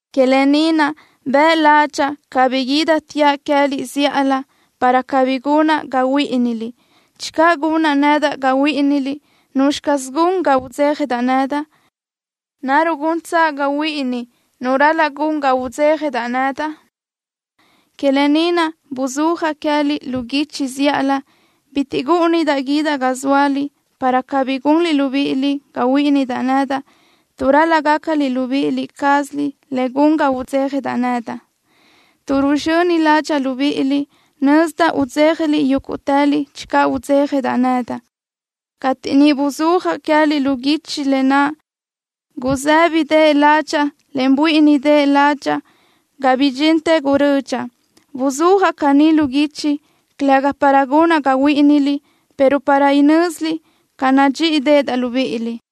Que lë ni naʼ bëʼ ládxaʼa cabí guídateaʼ queë́liʼ zíʼalö, para cabí gunaʼ ga huíʼiniliʼ. Channö gunaʼ nedaʼ ga huíʼiniliʼ, ¿nuzxi caz gun ga udzéjadaʼ nedaʼ? ¿Naruʼ guntsaʼ ga huíʼini nu ral-laʼ gun ga udzéjadaʼ nedaʼ? Que lë ni naʼ buzúajaʼ queë́liʼ lu guichi zíʼalö. Bitiʼ gúʼunidaʼ guídaʼ ga zóaliʼ, para cabí gunliʼ libíʼiliʼ ga huíʼinidaʼ nedaʼ, tuʼ ral-laʼ gácaliʼ libíʼi cázaliʼ le gun ga udzéjadaʼ nedaʼ. Tuʼ ruzxöni ládxaʼa libíʼiliʼ, nözdaʼ udzéjaliʼ yúguʼtëliʼ channö udzéjadaʼ nedaʼ. Cateʼ niʼ buzúajaʼ queë́liʼ lu guichi lë naʼ, gusë́bideʼe ládxaʼa, en buíʼinideʼe ládxaʼa ga bidxintë gurödxaʼ. Buzúajaʼ caní lu guichi, calëga para gunaʼ ga huíʼiniliʼ, pero para inö́ziliʼ ca nadxíʼideʼedaʼ libíʼiliʼ.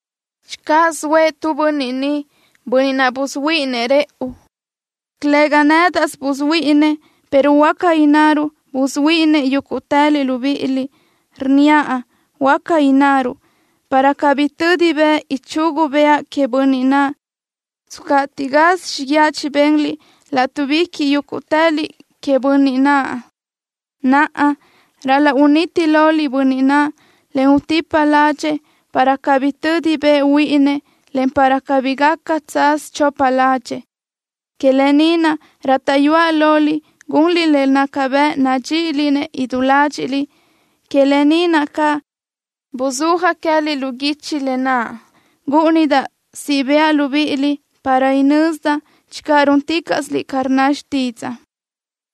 Channö zoëʼ tu bönniʼ niʼ, bönniʼ naʼ busuhuíʼininëʼ rëʼu, calëga nédaʼsö busuhuíʼininëʼ, pero huáca innaruʼ busuhuíʼininëʼ yúguʼtëliʼ libíʼiliʼ. Rnníaʼ: “Huaca innaruʼ”, para cabí tödi bëʼ ichugu bëʼa queëʼ bönniʼ naʼ. Tscatiʼ gaz xíguiaʼ chibenliʼ látuʼbiquiʼ yúguʼtëliʼ queëʼ bönniʼ naʼ. Naʼa, ral-laʼ uniti loliʼ bönniʼ naʼ, en utípaliʼ ládxëʼë, para cabí tödi bëʼ huíʼininëʼ, en para cabí gaca tsaz chopa ládxëʼë. Que lë ni naʼ rátaʼyuaʼ loliʼ gunliʼ le gaca bëʼ nadxíʼiliʼ-nëʼ idú ládxiʼliʼ. Que lë ni naʼ caʼ buzúajaʼ queë́liʼ lu guichi lë naʼ. Gúʼunidaʼ siʼ bëʼa libíʼiliʼ para inözdaʼ channö rúnticaʼsiliʼ ca rnna xtídzaʼa.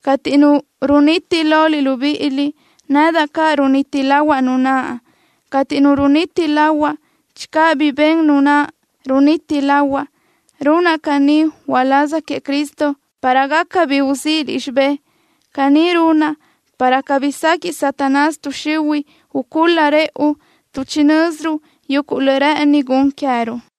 Cateʼ nu runiti loliʼ libíʼiliʼ, nedaʼ caʼ runiti lahuaʼ nu naʼ. Cateʼ nu runiti lahuaʼ, channö bi ben nu naʼ runiti lahuaʼ, runaʼ caní uláz queëʼ Cristo para gaca bi uzíʼiliʼ xibé. Caní runaʼ, para cabí sequiʼ Satanás tuʼ xihuiʼ ucúl-la rëʼu, tuʼ chinö́ziruʼ yuguʼ le rë́ʼëni gun queë́ruʼ.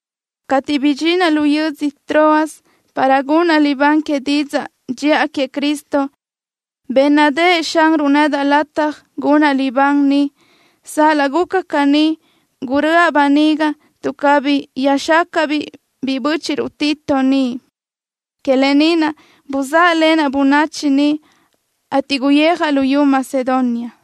Cateʼ bidxinaʼ lu yödzö Troas para gunaʼ libán que didzaʼ dxiʼa queëʼ Cristo, bénnadëʼë Xanruʼ nedaʼ lataj gunaʼ libán niʼ. Sal-laʼ guca caní, guröʼa böniga tuʼ cabí yöjxácaʼa-biʼ biʼi bö́chiʼruʼ Tito niʼ. Que lë ni naʼ buzáʼalenaʼ bönachi niʼ, ateʼ guyijaʼ luyú Macedonia.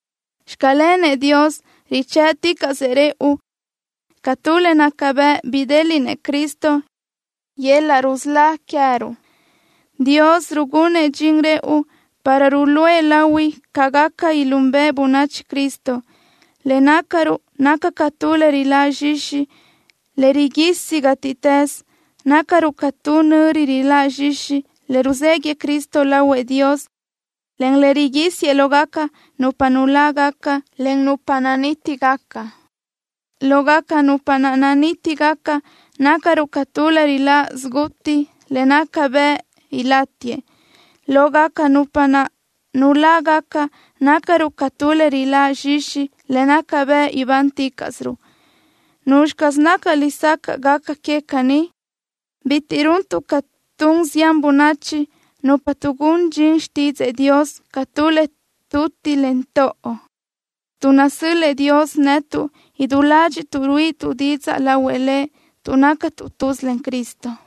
¡Xclenëʼ Dios! Richë́ʼticaʼsëʼ rëʼu ca tu le naca bëʼ bidéliʼnëʼ Cristo yöl-laʼ rusölá queë́ruʼ. Dios rugunëʼ dxin rëʼu para ruluʼë lahui ca gaca ilúnbëʼe bönachi Cristo. Le nácaruʼ naca ca tu le riláʼ zxixi, le riguisi gátiʼtës. Nácaruʼ ca tu nöri riláʼ zxixi, le ruzéguiʼë Cristo lahuëʼ Dios, en le riguísiëʼ lógaca nupa nulágaca, en nupa nanítigaca. Lógaca nupa naʼ nanítigaca nácaruʼ ca tu le riláʼ siguti le naca bëʼ ilátiëʼ. Lógaca nupa naʼ nulágaca nácaruʼ ca tu le riláʼ zxixi le naca bëʼ ibánticaʼsiruʼ. ¿Nuzxi caz naca lesacaʼ gaca que caní? Bitiʼ runtuʼ ca tun zián bönachi, nupa tuʼgún dxin xtídzëʼë Dios ca tu le tutiʼ, en toʼo. Tuʼ nasö́l-lëʼë Dios netuʼ, idú ládxiʼtuʼ ruíʼituʼ didzaʼ lahuëʼ Lëʼ tuʼ nácatuʼ tuz len Cristo.